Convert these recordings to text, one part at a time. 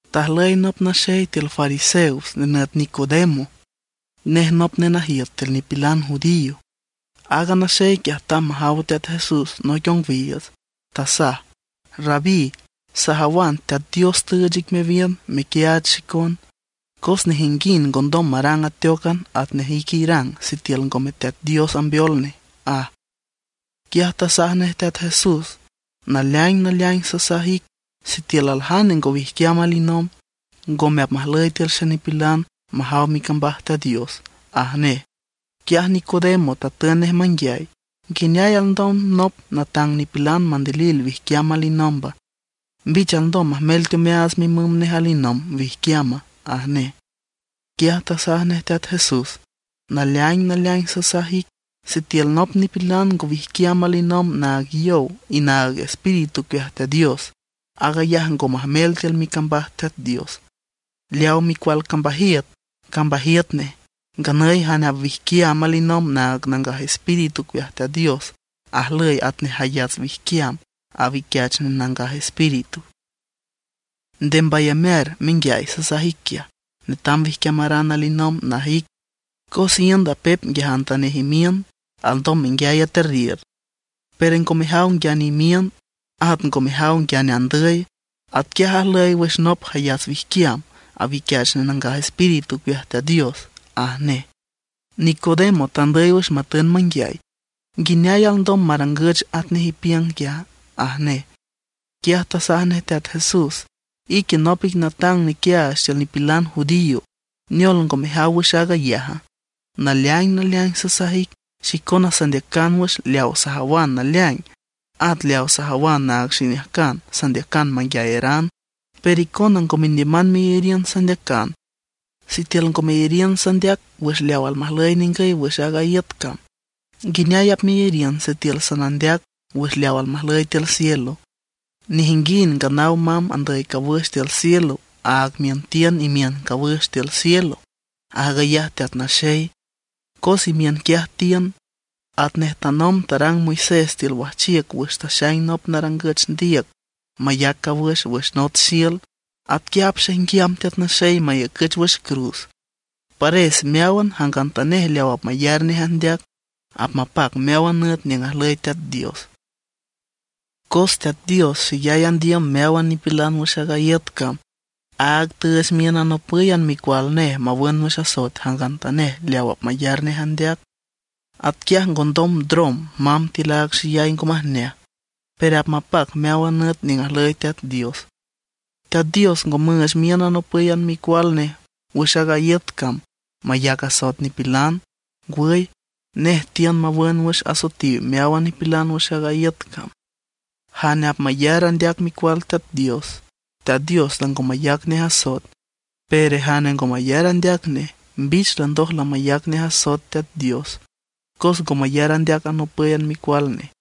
Tajlüy nop naxey tiül fariseos nenüt Nicodemo. Nej nop nenajiüt tiül nipilan judío. Aaga naxey quiaj tamb majaw Teat Jesús noic ongwiiüts. Tasaj: ―Rabí, sajawan Teat Dios tüüch ic mewiün mequiaach xicon; cos nejinguind ngondom marang ateócan atnej ique irang sitiül ngome Teat Dios ambeol nej ―aj. Quiaj tasaj nej Teat Jesús: ―Naleaing naleaing sasaj ic, sitiül aljane ngo wijquiam alinomb, ngome apmajlüy tiül xenipilan majaw micambaj Teat Dios ―aj nej. Quiaj Nicodemo tatün nej manguiay: ―¿Nguineay alndom nop natang nipilan mandilil wijquiam alinomba? ¿Mbich alndom majmel teomeaats mimüm nej alinomb wijquiama? ―aj nej. Quiaj tasaj nej Teat Jesús: ―Naleaing naleaing sasaj ic, sitiül nop nipilan ngo wijquiam alinomb naag yow y Nangaj Espíritu ocueaj Teat Dios, aag ayaj ngondom majmel tiül micambaj Teat Dios. Leaw micual cambajiüt, cambajiüt nej; nganüy jane apwijquiam alinomb naag Nangaj Espíritu ocueaj Teat Dios ajlüy atnej jayats wijquiam, awiquiach nej Nangaj Espíritu. Nde mbayamear menguiay sasaj ic quiaj: “Netam wijquiamaran alinomb”, naj ic. Cos iünd apep nguiajantanej imiün, alndom menguiay aterriür, pero ngo mejaw nguiane imiün, at ngo mejaw nguiane andüy. Atquiaj ajlüy wüx nop jayats wijquiam, awiquiach nej Nangaj Espíritu ocueaj Teat Dios ―aj nej. Nicodemo tandüy wüx matün manguiay: ―¿Nguineay alndom marangüch atnej ipiüng quiaja? ―aj nej. Quiaj tasaj nej Teat Jesús: ―Ique nop ic natang nequiaach tiül nipilan judío. ¿Neol ngo mejaw wüx aag ayaja? Naleaing naleaing sasaj ic, xicona sandeacan wüx leaw sajawan naleaing, at leaw sajawan naag xiniüjcan sandeacan manguiayaran. Pero icona ngo mendiüman meyariün sandeacan. Sitiül ngo meyariün sandeac wüx leaw almajlüy ningüy wüx aaga iüt cam, ¿nguineay apmeyariün sitiül sanandeac wüx leaw almajlüy tiül cielo? ’Nejinguind nganaw mamb andüy cawüx tiül cielo, áag miün tiün imiün cawüx tiül cielo, aag ayaj Teat Naxey, cos imiün quiaj tiün. Atnej tanomb tarang Moisés tiül wajchiüc wüx taxaing nop narangüch ndiüc mayac cawüx wüx nots xiül, atanquiaj apxaijnguiam Teat Naxey mayacüch wüx cruz. Pares meáwan jangantanej leaw apmayar nej andeac, apmapac meáwan nüt niüng ajlüy Teat Dios. ’Cos Teat Dios xeyay andiüm meáwan nipilan wüx aaga iüt cam, áag tüüch miün anopǘyan Micual Nej mawün wüx asoet jangantanej leaw apmayar nej andeac. Atquiaj ngondom ndrom mamb tiül aaga xeyay ngo majneaj; pero apmapac meáwan nüt niüng ajlüy Teat Dios. Teat Dios ngo müüch miün anopǘyan Micual nej wüx aaga iüt cam mayac asoet nipilan. Ngwüy, nej tiün mawün wüx asoetiw meáwan nipilan wüx aaga iüt cam. Jane apmayar andeac Micual Teat Dios, Teat Dios lango mayac nej asoet; pero jane ngo mayar andeac nej, mbich landoj lamayac nej asoet Teat Dios, cos ngo mayar andeac anopǘyan Micual Nej.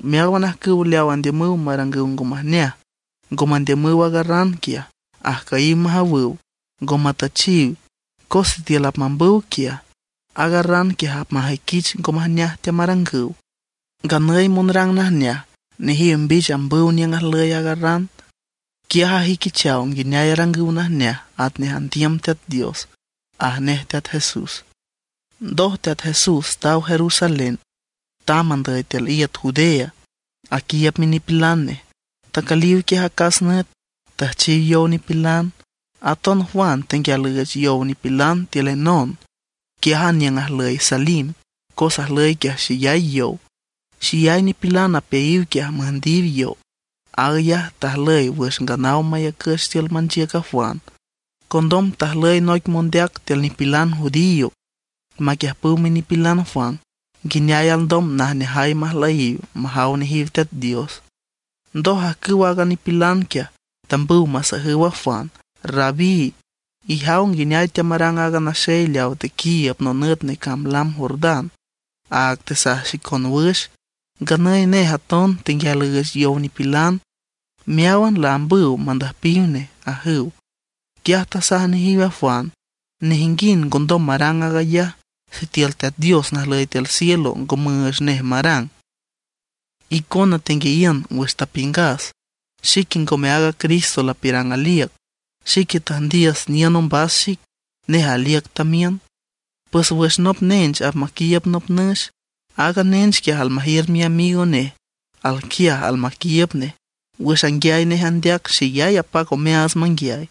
Meáwan ajcüw leaw andiümüw marangüw ngo majneaj ngo mandiümüw aaga ran quiaj, ajcüyiw majawüw, ngo matüchiw. Cos sitiül apmambüw quiaj, aaga ran quiaj apmajüiquich ngo majneaj teamarangüw. Nganüy monrang najneaj, nejiw mbich ambüw niüng ajlüy aaga ran. Quiaj ajüiquichaw nguineay arangüw najneaj atnej andiüm Teat Dios ―aj nej Teat Jesús. Ndoj Teat Jesús taw Jerusalén tamb andüy tiül iüt Judea aquiiüb minipilan nej. Tacüliw quiaj acas nüt, tüjchiw yow nipilan. Aton Juan tenguial üüch yow nipilan tiül Enon, quiájan niüng ajlüy Salim cos ajlüy quiaj xeyay yow. Xeyay nipilan apeayiw quiaj müjndiw yow. Aag ayaj tajlüy wüx nganaw mayacüch tiül manchiüc a Juan. Condom tajlüy noic mondeac tiül nipilan judío maquiüjpüw minipilan Juan nguineay alndom najneajay majlüyiw majaw nejiw Teat Dios. Ndoj ajcüw aaga nipilan quiaj, tambüw masajüw a Juan: ―Rabí, ijaw nguineay teamarang aaga naxey leaw tequiiüb nonüt necamb lam Jordán, áag tesaj xicon wüx. Nganüy nej aton tenguial üüch yow nipilan, meáwan laambüw mandüjpiw nej ―ajüw. Quiaj tasaj nejiw a Juan: ―Nejinguind ngondom marang aag ayaj sitiül Teat Dios najlüy tiül cielo ngo müüch nej marang. Icona tenguiayiün wüx tapiüngas, xique ngome aaga Cristo lapiürang aliüc. Xique tüjndiüs niün ombas xic, nej aliüc tamiün. Pues wüx nop nench apmaquiiüb nop nüx, aaga nench quiaj almajiür miamigo nej alquiaj almaquiiüb nej. Wüx anguiay nej andeac xeyay apac omeaats manguiay.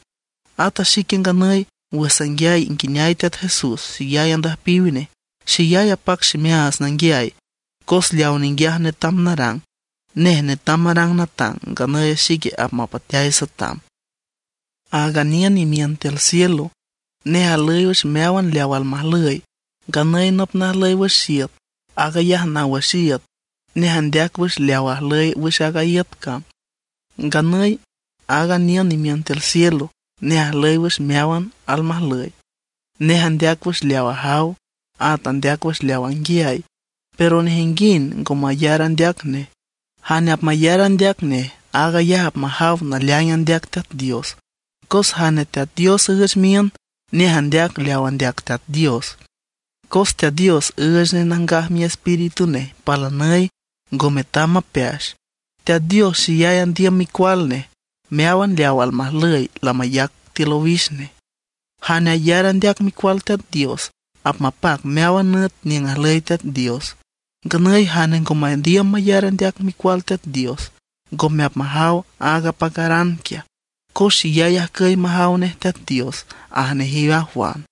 Ata xique nganüy wüx sanguiay nguineay Teat Jesús xeyay andüjpiw nej, xeyay apac ximeaats nanguiay, cos leaw ninguiaj netam narang. Nej netam marang natang, nganüy xique apmapateay satam. ’Aaga niün imiün tiül cielo, nej ajlüy wüx meáwan leaw almajlüy. Nganüy nop najlüy wüx iüt, aag ayaj naw wüx iüt; nej andeac wüx leaw ajlüy wüx aaga iüt cam. Nganüy aaga niün imiün tiül cielo, nej ajlüy wüx meáwan almajlüy. Nej andeac wüx leaw ajaw, at andeac wüx leaw anguiay; pero nejinguind ngo mayar andeac nej. Jane apmayar andeac nej, aag ayaj apmajaw naleaing andeac Teat Dios. Cos jane Teat Dios üüch miün, nej andeac leaw andeac Teat Dios, cos Teat Dios üüch nej Nangaj Miespíritu nej palanüy, ngo metam mapeax. Teat Dios xeyay andiüm Micual Nej; meáwan leaw almajlüy lamayac tiül owix nej. Jane ayar andeac Micual Teat Dios apmapac meáwan nüt niüng ajlüy Teat Dios. Nganüy jane ngo mandiüm mayar andeac Micual Teat Dios, ngome apmajaw aaga apacaran quiaj cos xeyay ajcüy majaw nej Teat Dios ―aj nejiw a Juan.